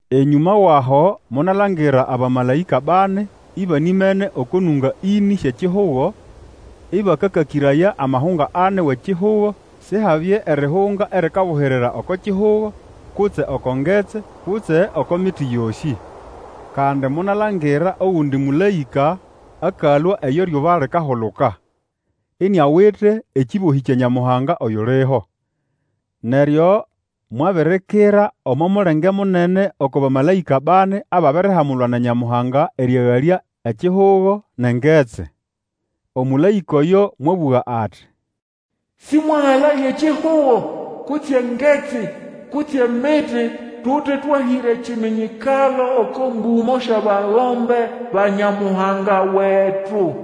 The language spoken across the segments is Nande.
Enyũma wʼaho monalangira abamalaĩka bani ibanimene oko nũnga ĩnĩ syʼekihugo, ĩbakakakĩraya amahunga ani wʼekihugo, Sihabye erihunga erikabuhirira oko kihugo, kutse oko ngetsi, kutse oko miti yosĩ. Kandi monalangira ogundi mũlaĩka akalũa eyo eryuba likahuluka, iniawite ekĩbohĩ kya Nyamuhanga oyuliho. Neryo mwabirikira omo mulenge munene oko bamalaĩka bani ababirihamulwa na Nyamuhanga erĩagalya ekihugo nʼengetsi. Omũlaĩka oyo mwabũga ati, Sĩmwagalaye ekihugo, kutse ngetsi, kutse miti, tute twahĩra ekiminyikalo oko mbũmo syʼabagombe ba Nyamuhanga wetu.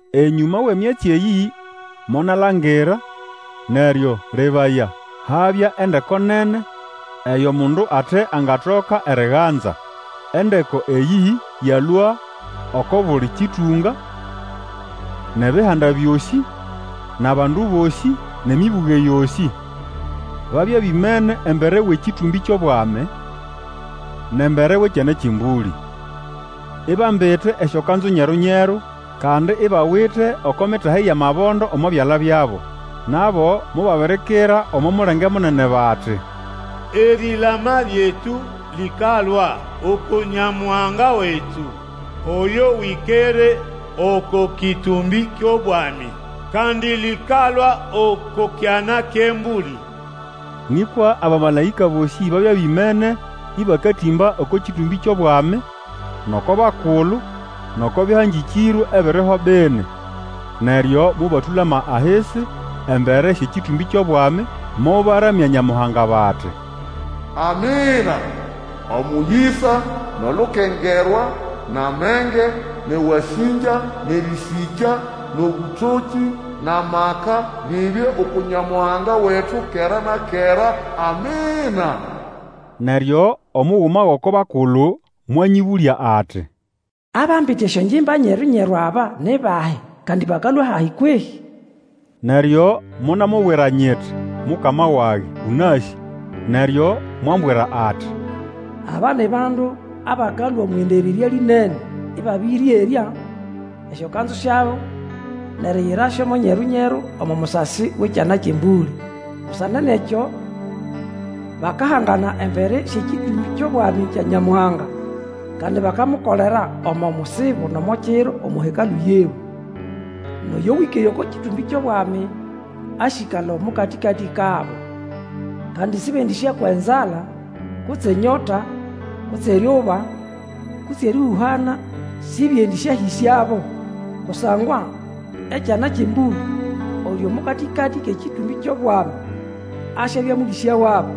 Enyũma wʼemyatsi eyĩ monalangira, neryo, lebaya, habya endeko nene, eyo mundu ate angatoka eriganza. Endeko eyĩ yalũa oko buli kĩtũnga, nʼebihanda byosĩ, nʼabandu bosĩ, nʼemĩbũge yosĩ. Babya bimene embere wʼekĩtũmbĩ kyʼobwami, nʼembere wʼEkyana kyʼEmbũlĩ, ibambite esyokanzu nyeru-nyeru, kandi ibawite oko mitahi yʼamabondo omo byala byabo. Nabo mobabirikira omo mulenge munene bati, Erilama lyetu lĩkalũa uku Nyamuhanga wetu, oyo wĩkere oko kĩtũmbĩ kyʼobwami, kandi lĩkalũa oko Kyana kyʼEmbũlĩ! Nĩkwa abamalaĩka bosĩ babya bimene ĩbakatĩmba oko kĩtũmbĩ kyʼobwami, nʼoko bakulu, nʼoko bĩhangĩkĩrwe ebiriho bini. Neryo mobatũlama ahisi embere syʼekĩtũmbĩ kyʼobwami, mobaramya Nyamuhanga bati, Amina! omũyĩsa, nʼolukengerwa, nʼamenge, nʼewasĩngya, nʼerĩsĩkya, nʼobũtokĩ, nʼamaka, bibye uku Nyamuhanga wetu kera na kera! Amina! Neryo omuguma gʼoko bakulu mwanyĩbũlya ati, Abambite esyongimba nyeru-nyeru aba, ni bahi, kandi bakalũa hayi kwehĩ? Neryo monamubwira nyiti, Mukama wage, ũnasĩ. Neryo mwambwira ati, Aba ni bandu abakalũa omwʼendererya lĩnene, ĩbabĩrĩerya esyokanzu syabo nʼeriyirasyo mo nyeru-nyeru omo musasi wʼEkyana kyʼEmbũlĩ. Busana nʼekyo bakahangana embere syʼekĩtũmbĩ kyʼobwami kya Nyamuhanga, kandi bakamukolera omo musibo nʼomo kiro omo Hekalũ yiwe. Nʼoyo wĩkere oko kĩtũmbĩ kyʼobwami asyĩkala omo katĩkatĩ kabo. Kandi Sĩbendĩsyakwa enzala, kutse enyota, kutse eryuba, kutse erĩhũhana sibyendisyahĩsyabo. Kusangwa, Ekyana kyʼEmbũlĩ oyuli omo katĩkatĩ kʼekĩtũmbĩ kyʼobwami, asyabya mũlĩsya wabo,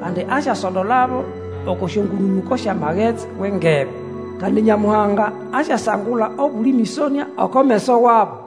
kandi asyasondolabo oko syongũnũnũko syʼamagetsi wʼengebe; kandi Nyamuhanga asyasangula obuli mĩsonĩa oko meso wabo.